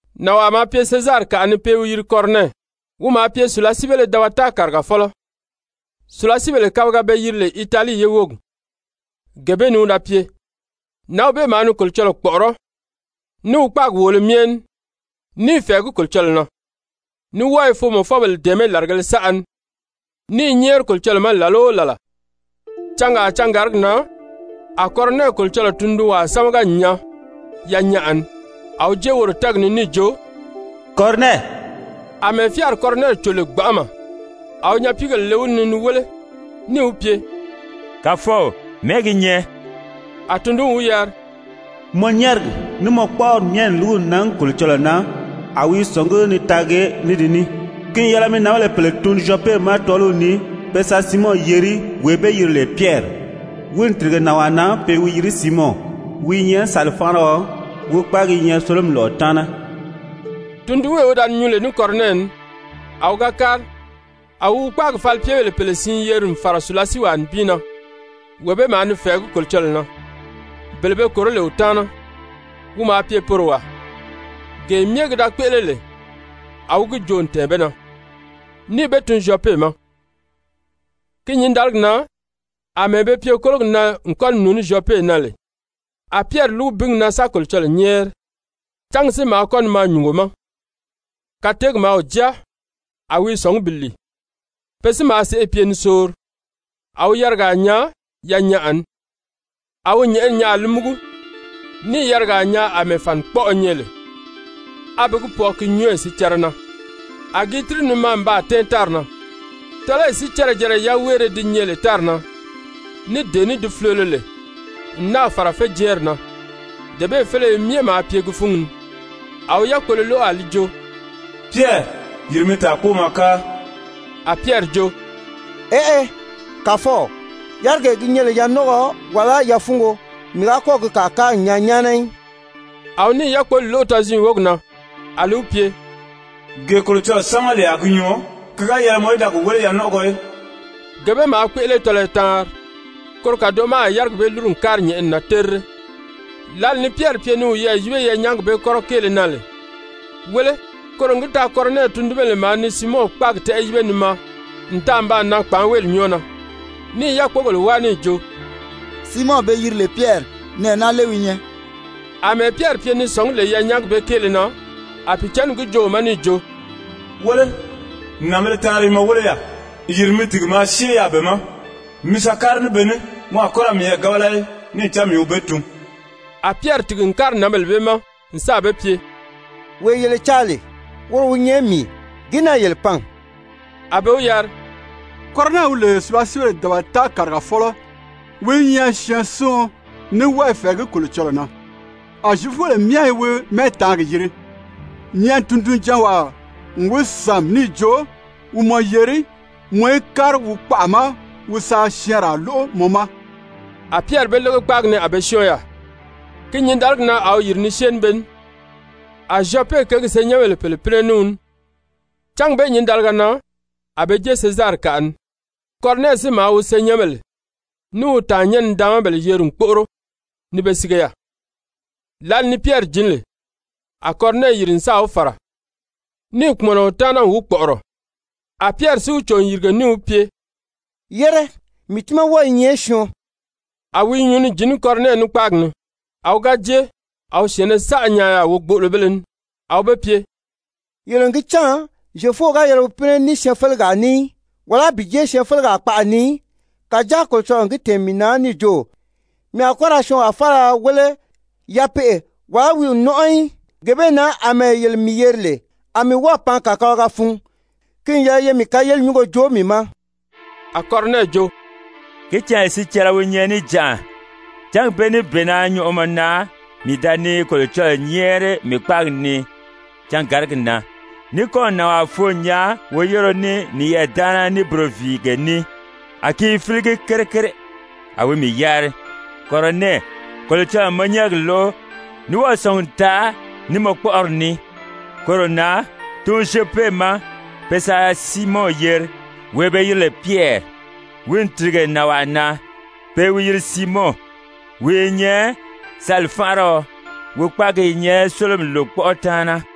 Nànwaa maa pye Sezarikaʔa ni pe i wi yiri Kɔrɔnɛ, wi maa pye sùlasiibéle dabata kàrigafɔlɔ, sùlasiibèle kabiga be yiri lè Italii ye wógi, gee bee ni wi da pye. Nǎnw bee maa ni Kolocɔlɔɔ kpɔ̀ʔɔrɔ́ ní wi kpáagi wòolo myɛ ní, ní i fɛ̀ɛgí Kolocɔlɔɔ na, ní wɔ́ɔ i foomɔfɔbèle dɛ̀ɛmɛ́ làrigēle saʔa ni, ní i nyɛ́ɛri Kolocɔlɔɔ ma làla o làla. Cangaa cangàrigi na a Kɔrɔnɛ Kolocɔlɔɔ tundunwaa sámaga n nyaa yanyaʔa ni, a wi jée woro tɛ́ɛgi ni níì jo: «Kɔrɔnɛ.» Amɛɛ fyáari Kɔrɔnɛ cò lè gbanʔama, a wi nyapiigèle le wi ni ni wéle níì wi pye: «Kàfɔw, mɛ̀ɛ́ gi nyɛ?» A tundunw wi yari: «Mɔ nyɛ́ɛrigi, ní mɔ kpɔ́ʔɔri myɛ n lúgu n nan Kolocɔlɔɔ na, a wi i sɔ̀ngí ni taagi ní di ní. Ki n yɛlɛ mi nǎnbèle pèle tun Zyɔpe ma tɔ́ɔliw ni pe sa Siimɔn yeri, wee be yiri lè Pyɛri. Wi n tìrige nànwaa na, pe i wi yiri Siimɔn, wi i nyɛ sali-fánʔariɔ, wi kpáagi i nyɛ sólomi lɔ̀ʔɔ taana.» Tundunwee wi da ni nyuu lè ní Kɔrɔnɛ ní, a wi ga kári, a wi wi kpáagi falipyebèle pèle siin yeri n fàra sùlasiiwaa nibin na, wee bee maa ni fɛ̀ɛgí Kolocɔlɔɔ na, bele be kòró lè wi taana, wi maa pye poro wàa. Gee myɛ ki da kpéʔele lè, a wi gi joo n tɛ̀ɛn be na, níì be tun Zyɔpe ma. Ki nyǐndaligi na àmɛɛ be pye kólogi na n kɔ́ ni nùuní Zyɔpe na lè, a Pyɛri lúgu bíngi na sa Kolocɔlɔɔ nyɛ́ɛri, cángi si maa kɔ́ ni maa nyùngo ma. Kateegi maa wi jáa, a wi i sɔ̀ngí bi lìi. Pe si maa sèʔê pye ni soori, a wi yarigaa nyaa yanyaʔa ni. A wi nyɛ̀ʔɛni nyaa a li múgu, níì yarigaa nyaa àmɛɛ fànikpɔʔɔ nyɛ lè, a be gi pwɔɔ ki nyɔ́ɔyi sicɛrɛ na. A gi i tíri ni maa n baa tɛ́ɛn tári na. Tɔ́lɔyi sicɛrɛ-jɛrɛ yaweere ti nyɛ lè tári na, ní dee ní di fulolo lè, n náà fàra féjɛɛnri na, dee bee féleye myɛ maa pye gi fúngi ni. A wi yákpolo lóʔo a li jo: «Pyɛri, yìri mi tàa kpóo maa káa.» A Pyɛri jo: «Eʔe, Kàfɔw, yárigee gi nyɛ lè yanɔnʔɔgɔ wàlá yafuungo, mii ga kɔ́ɔ̀ gi kàa káa n nyaa nyáana í.» A wi níì yákpoli lóʔo tɔziin wógi na a li wi pye: «Gee Kolocɔlɔɔ sámaga lè a gi nyɔɔ, ki ga yɛlɛ mɔ í da gi wéle yanɔnʔɔgɔ í.» Gee bee maa kpéʔele tɔlɔyɔ taanri. Koro kàdoʔo ma a yárigi bee lúru n kári nyɛ̀ʔɛni na terire. Lǎli ni Pyɛri pye ni wiyɛɛ yíbe yanyaagi bee kɔ́rɔ kéele na lè, wéle, koro n gi taa Kɔrɔnɛ tundunbèle maa ni Siimɔn kpáagi tɛ́ʔɛ yíbe ni maa n taa n baa nan kpàánweeli nyɔ́ɔ na, níì yákpogèle wáa níì jo: «Siimɔn be yiri lè Pyɛri, nɛɛ naa lé wi nyɛ?» Amɛɛ Pyɛri pye ni sɔ̀ngí lè yanyaagi bee kéele na, a Pìicǎnni gi joo wi ma níì jo: «Wéle, nànbēle taanri i mɔ wéle yaà. Yìri mi tìgi maa syée yaà be ma, mi sa kári ní be ní, mɔ a kɔ́ ra miyɛɛ gábala í, níì cán mii wi be tun.» A Pyɛri tìgi n kári nǎnbèle bee ma n sáà be pye: «Wee yele caa lè, woro wi nyɛ mii. Gìí na yele pan?» A be wi yari: «Kɔrɔnɛ wi lè sùlasiibèle dabata kàrigafɔlɔ, wi i nyɛ syɛɛnsiɔn ní wɔ́ɔ i fɛ̀ɛgí Kolocɔlɔɔ na, a Zyefubèle myɛ i wi mɛ́ɛtaangi yiri, nyɛ̀ʔɛni tundunjanwaa n wi sàmi níì jo wi mɔ yeri mɔ í kári wi kpaʔa ma wi sa syɛɛnraa lóʔo mɔ ma.» A Pyɛri be lége kpáagi ni a be syɔ́ɔn yaà. Ki nyǐndaligi na a wi yìri ni syée ní be ní. A Zyɔpe kěgi senyɛnbèle pèle pínɛ ní wi ní. Cángi bee nyǐndaliga na a be jée Sezarikaʔa ni. Kɔrɔnɛ si maa wi senyɛnbèle ní wi tàannyɛn-nidaanmabèle yeri n kpóʔoro ni be sige yaà. Lǎli ni Pyɛri jǐn lè, a Kɔrɔnɛ yìri n sáà wi fàra, níì kpùmɔnɔ wi taana n wi kpɔ̀ʔɔrɔ. A Pyɛri si wi cò n yìrige níì wi pye: «Yére, mii tiimaa wɔ́ɔ i nyɛ syɔɔn.» A wi i nyuu ni jǐn ní Kɔrɔnɛ ní kpáagi ni, a wi ga jée, a wi syɛ̀ɛnnɛ saʔa nyaa yaà wogboʔolobéle ní. A wi be pye: «Yele n gi cán Zyefuo ga yɛlɛ wi pínɛ ní syɛɛnfelegaa ní í, wàlá bi jée syɛɛnfelegaa kpaʔa ni í. Kàjáa Kolocɔlɔɔ n gi tɛ̀ɛn mii na níì jo, mii a kɔ́ ra syɔɔnwaa faala wéle yapeʔe wàlá wi n nɔ́nʔɔ í. Gee bee na àmɛɛ yele mii yeri lè, a mii wɔ́ɔ̀ pan kàkabalaga fun. Ki n yɛlɛ ye mii kayerili nyúngo joo mii ma.» A Kɔrɔnɛ jo: «Ki canya sicɛrɛ wi nyɛ níjanʔa, cángi bee níbeena nyɔʔɔmɔ na mii da ni Kolocɔlɔɔ nyɛ́ɛri mii kpáagi ni cangàrigi na, ní kɔ́ɔ̀ nànwaa foo n nyaa woyéreo ní niyɛɛ daana ní buroviige ní, a ki i fíligi kere kere. A wi mii yari: ‹Kɔrɔnɛ, Kolocɔlɔɔ n mɔ nyɛ́ɛrigi lóʔo ní wɔ́ɔ̀ sɔ̀ngi n taa ní mɔ kpɔ́ʔɔri ní. Koro na, tun Zyɔpe ma pe sa Siimɔn yeri, wee be yiri lè Pyɛri. Wi n tìrige nànwaa na, pe i wi yiri Siimɔn, wi i nyɛ sali-fánʔariɔ, wi kpáagi i nyɛ sólomi lòkpɔʔɔ taana.›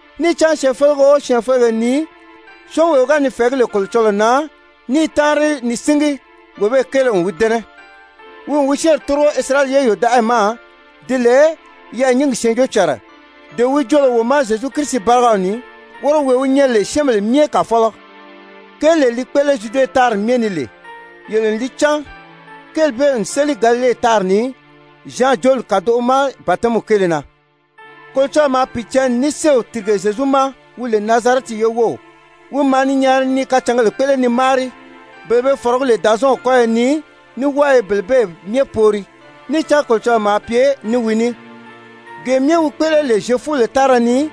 Níì cán syɛɛnfelege o syɛɛnfelege ni, syɔ́ɔnwee wi ga ni fɛ̀ɛgí lè Kolocɔlɔɔ na ní i táanri ni síngi, wee bee kéele n wi dɛ́nɛ. Wi n wi syɛ́ɛnri tórigo Isirayɛli ye yòdaʔayi ma, di lè yɛɛ̀nyingi syɛɛnjóocànra dee wi joo lè wo ma Zyezu Kirisi bárigaw ni, woro wee wi nyɛ lè syɛ́ɛnbèle myɛ Kàfɔlɔ. Kéelee li kpéʔele Zyude tári myɛ ni lè, yele n li cán, kéeli bee n séli Galile tári ni Zyan jooli kàdoʔo ma batɛmiw kéele na. Kolocɔlɔɔ maa Pìicǎnni ní séew tìrige Zyezu ma, wi lè Nazarɛti ye wów, wi maa ni nyaari ni kacǎngèle kpéʔele ni máari, bele be fɔ̀rɔgí lè Dàzɔɔnw kɔ́yɔ ni, ní wɔ́ɔ i bele bee myɛ poori. Níì cán Kolocɔlɔɔ maa pye ní wi ní. Gee myɛ wi kpéʔele lè Zyefubèle tára ni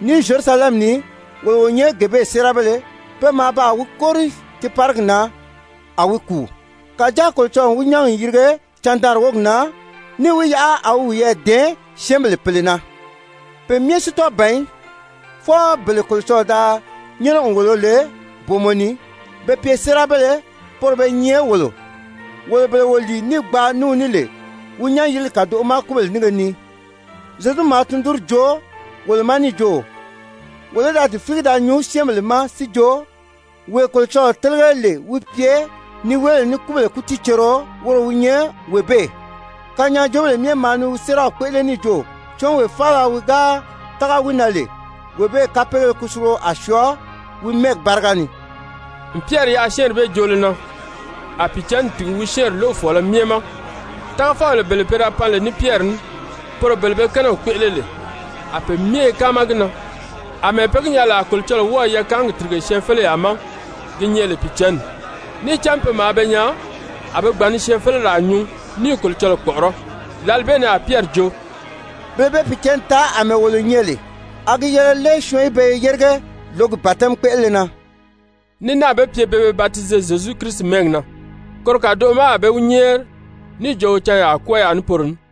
ní Zyerusalɛmi ni, wolo wo nyɛ gee bee séerabéle. Pe maa baa wi kóri tiiparigi na, a wi kùu. Kàjáa Kolocɔlɔɔ n wi nyán n yirige candaanri wógi na, níì wi yaʔa a wi wiyɛɛ dɛ̀ɛn syɛ́ɛnbèle pèle na. Pe myɛ si tɔ́ɔ ban í, fwɔɔ bele Kolocɔlɔɔ da nyɛ́nɛ n wòlo lè booma ni be pye séerabéle, poro be nyɛ wolo, wolo bele wo lìi níì gbaa ní wi ní lè wi nyán-yirili kàdoʔo ma kúbèle nínge ni. Zyezu maa tundunri joo wolo ma níì jo, wolo í da di fíligi da nyuu syɛ́ɛnbèle ma si jo, wee Kolocɔlɔɔ télege lè wi pye niweebèle ní kúbèle kútiicerio, woro wi nyɛ wee bee. Kanyaajoobèle myɛ maa ni wi séeraw kpéʔele níì jo: ‹Syɔ́ɔnwee faala wi ga tága lè wi na, wee bee kapeegéle kusulugo a syɔɔ wi mɛ́ɛgi báriga ni.›» N Pyɛri yaʔa syɛ́ɛnri bee joolo na, a Pìicǎnni tìgi wi syɛ́ɛnri lóʔofɔɔlɔ myɛ ma. Tágafɔbèle bele be pan lè ní Pyɛri ní, poro bele be kɛ́nɛw kpéʔele lè, a pe myɛ i káama gi na àmɛɛ pe gi nyaa lè a Kolocɔlɔɔ wɔ́ɔ̀ yakaangi tìrige syɛɛnfeleyaa ma gi nyɛ lè Pìicǎnni. Níì cán pe maa be nyaa a be gbàn ni syɛɛnfeleraa nyuu ní i Kolocɔlɔɔ kpɔ̀ʔɔrɔ́. Lǎli bee ni a Pyɛri jo: «Bele be Pìicǎnni taa àmɛɛ wolo nyɛ lè, a gi yɛlɛ lé syɔɔn í be yérige lǒgi batɛmi kpéʔelele na?» Ní náà be pye pe be batize Zyezu Kirisi mɛ́ɛgi na. Koro kàdoʔo ma a be wi nyɛ́ɛri níì jo wi canyaa kwɔ́ɔ yaà ní poro ní.